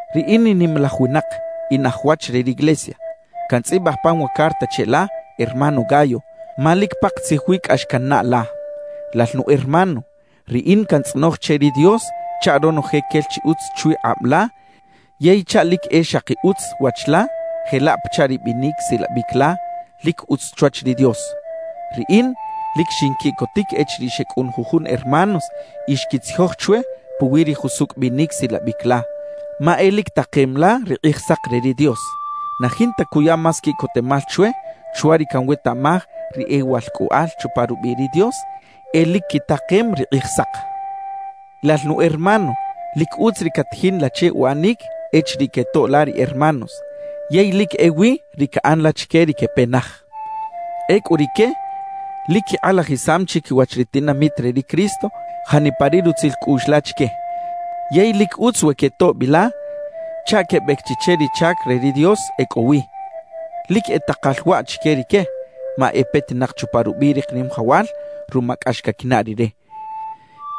Riꞌin in nimalaj winak, in aj wach re riglesia; cantzꞌibaj pan wa carta cheꞌla, hermano Gayo, ma lic pakatzij wi cꞌax cannaꞌ la. Lal nu hermano, riꞌin cantzꞌonoj che ri Dios chaꞌ ronoje quel chi utz chwi kꞌab la yey chaꞌ lic e xaki utz wach la jelaꞌ pachaꞌ ri binic silabic la lic utz chwach ri Dios. Riꞌin lic xinquiꞌcotic echiriꞌ xecꞌun jujun hermanos y xquitzijoj chwe puwi ri jusucꞌ binic silabic la, ma e lic takem la ri Kꞌijsak re ri Dios. Na jinta cuya más quiꞌcotemal chwe chwa ri canwetaꞌmaj ri e walcꞌoꞌal chupa rubiꞌ ri Dios e lic quitakem ri Kꞌijsak. Lal nu hermano, lic utz ri catajin la che uꞌanic echiriꞌ quetoꞌ la ri hermanos, yey lic ewi ri caꞌan la chique ri quepe naj. Ecꞌu rique lic quikꞌalajisam chiquiwach ri tinamit re ri Cristo janipa ri rutzil cꞌuꞌx la chique. Yey lic utz we quetoꞌ bi la chaꞌ quebec chi che ri chac re ri Dios e cꞌo wi. Lic e takal waꞌ chique rique ma e petinak chupa rubiꞌ ri Kanimajawal ruma cꞌax caquinaꞌ Rire,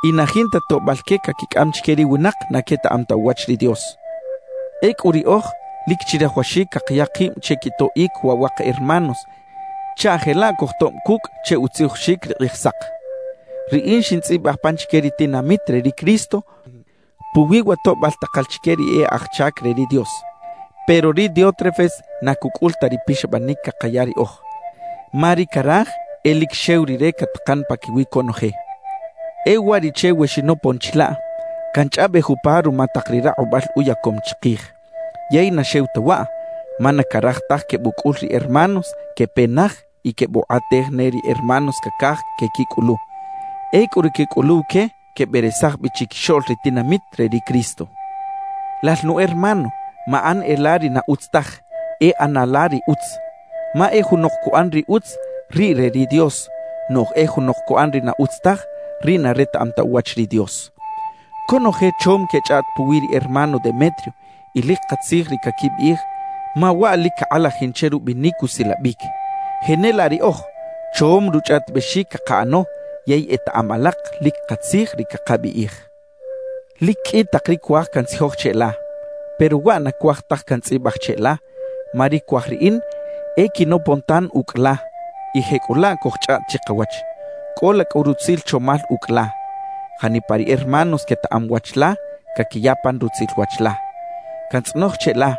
y na jinta toꞌbal que caquicꞌam chique ri winak na quetaꞌam ta uwach ri Dios. Ecꞌu riꞌoj, lic chirajawaxic cakaya kib che quitoꞌic waꞌ wa ka hermanos chaꞌ jelaꞌ cojtoꞌb cucꞌ che utzijoxic ri Kꞌijsak. Riꞌin xintzꞌibaj pan chique ri tinamit re ri Cristo puwi wa toꞌbal takal chique ri e aj chac re ri Dios, pero ri Diótrefes na cucꞌul ta ri pixabanic cakaya riꞌoj, ma ri caraj e lic xew rire catakan paquiwi conoje. E uwariꞌche we xinopon chilaꞌ, canchꞌaꞌbej upa ruma tak ri rakꞌubal uyacom chikij. Yey na xew ta waꞌ, ma na caraj taj quebucꞌul ri hermanos quepe naj y quebukꞌatej ne ri hermanos cacaj quequicꞌulu. Ecꞌu ri quecꞌuluw que queberesaj bi chiquixoꞌl ri tinamit re ri Cristo. Lal nu hermano, maꞌan e la ri na utz taj; e ꞌana la ri utz. Ma e junok cuꞌan ri utz, riꞌ re ri Dios; noꞌj e junok cuꞌan ri na utz taj, riꞌ na retaꞌam ta uwach ri Dios. Conoje chom quechꞌaꞌt puwi ri hermano Demetrio y lic katzij ri caquibiꞌij ma waꞌ lic cakꞌalajin che rubinic usilabic. Jenelaꞌ riꞌoj, chom ruchꞌaꞌtibexic cakaꞌano yey etaꞌam alak lic katzij ri cakabiꞌij. Lic qꞌui tak ri cuaj cantzijoj cheꞌla, pero waꞌ na cuaj taj cantzꞌibaj cheꞌla ma ri cuaj riꞌin e quinopon tan ucꞌ la y jecꞌulaꞌ cojchꞌaꞌt chikawach. Cꞌola cꞌu rutzil chomal ucꞌ la. Janipa ri hermanos quetaꞌam wach la caquiya pan rutzil wach la. Cantzꞌonoj cheꞌla,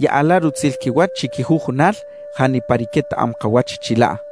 yaꞌa la rutzil quiwach chiquijujunal janipa ri quetaꞌam kawach chilaꞌ.